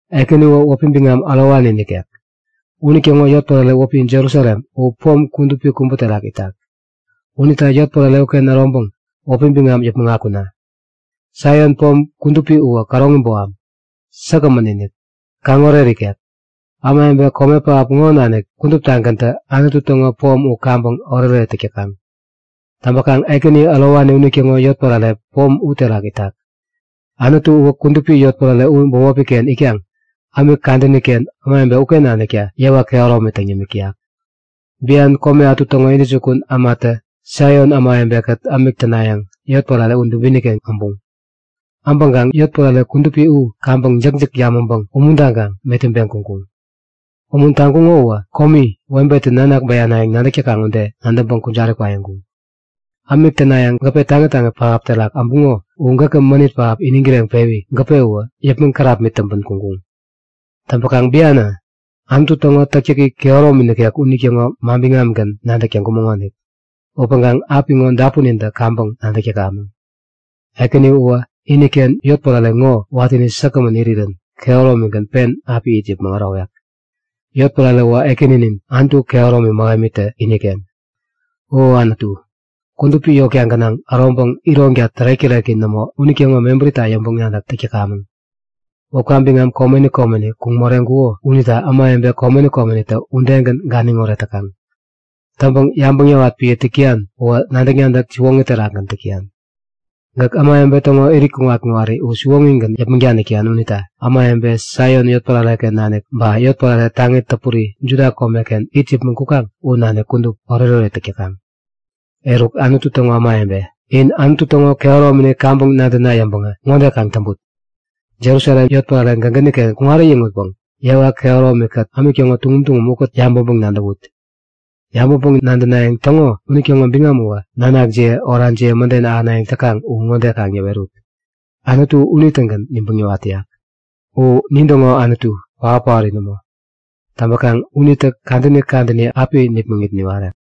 Ekäni uwä wäpi biŋam ärowani nikek. Unitäŋo yotpärare wäpi Jerusalem u pom kudupi kubä terak itak. Unita yotpärare uken äroŋpäŋ wäpi biŋam yäpmäŋ akuna! Saion Pom kudupi uwä käroŋi boham, tägagämän-inik, kaŋoret ikek. Ämawebe kome pähap ŋo nanik kuduptagäntä Anutu täŋo pom u kaŋpäŋ oretoret täk täkaŋ. Täŋpäkaŋ Ekäni Ärowani unitäŋo yotpärare pom u terak itak. Anutu uwä kudupi yotpärare u bämopiken itkaŋ ämik kadäniken ämawebe uken nanikta yewa kehäromi täŋ yämik täyak. Bian kome ätu täŋo intäjukun ämatä Saion ämawebekät ämik tänayäŋ yotpärare u dubiniken äbuŋ. Äbäŋkaŋ yotpärare kudupi u kaŋpäŋ jäkjäk yamäŋpäŋ umuntaŋkaŋ metäŋpeŋ kuŋkuŋ. Umuntaŋkuŋo uwä komi webetä nanak bäyanayäŋ nadäk täkaŋ ude nadäŋpäŋ kujari kwaiŋkuŋ. Ämik tänayäŋ gäpe taŋi taŋi pähap terak äbuŋo u gäkä mänit pähap iniŋ kireŋpewi gäpe uwä yäpmäŋ kärapmit täŋpän kuŋkuŋ. Täŋpäkaŋ bianä, Anutu täŋo täktäki kehäromi nikek unitäŋo manbiŋamgän nadäk täŋkumäŋonik. Upäŋkaŋ apiŋo dapunintä kaŋpäŋ nadäk täkamäŋ. Ekäni uwä iniken yotpärare ŋo watäni säkgämän irirän kehäromigän pen api it yäpmäŋ ärowek. Yotpärare uwä Ekäninin, Anutu kehäromi mähemitä iniken. O Anutu, kudupi yotka gänaŋ äroŋpäŋ ironka tärek-täreki nämo unitäŋo mebärita yäŋpäŋ-nadäk täk täkamäŋ. Wäpka biŋam komeni komeni kuŋ moreŋkuko unita ämawebe komeni komenitä udegän ganiŋoret täkaŋ. Täŋpäŋ yabäŋ yäwat piä täk täyan uwä nadäk-nadäk siwoŋi terakgän täk täyan. Gäk ämawebe täŋo irit kuŋat-kuŋari u siwoŋigän yäpmäŋ danik täyan unita ämawebe Saion yotpärareken nanik ba yotpärare taŋi täpuri Juda komeken it yäpmäŋ kukaŋ u nanik kudup, oretoret täk täkaŋ. Eruk, Anutu täŋo ämawebe, in Anutu täŋo kehäromini kaŋpäŋ nadäna yäŋpäŋä ŋode kaŋ täŋput; Jerusalem yotpärare gägäniken kuŋat äyäŋutpäŋ yewa kehäromikät ämik täŋo tuŋum tuŋum ukät yabäŋpäŋ-nadäwut. Yabäŋpäŋ-nadänayäŋ täŋo unitäŋo biŋam uwä nanakjiye orajiye mäden ahänayäŋ täkaŋ u ŋode kaŋ yäwerut; Anutu unitägän nibäŋ niwat täyak. U nintäŋo Anutu, paot-paori nämo. Täŋpäkaŋ unitä kadäni kadäni api nipmäŋit niwarek.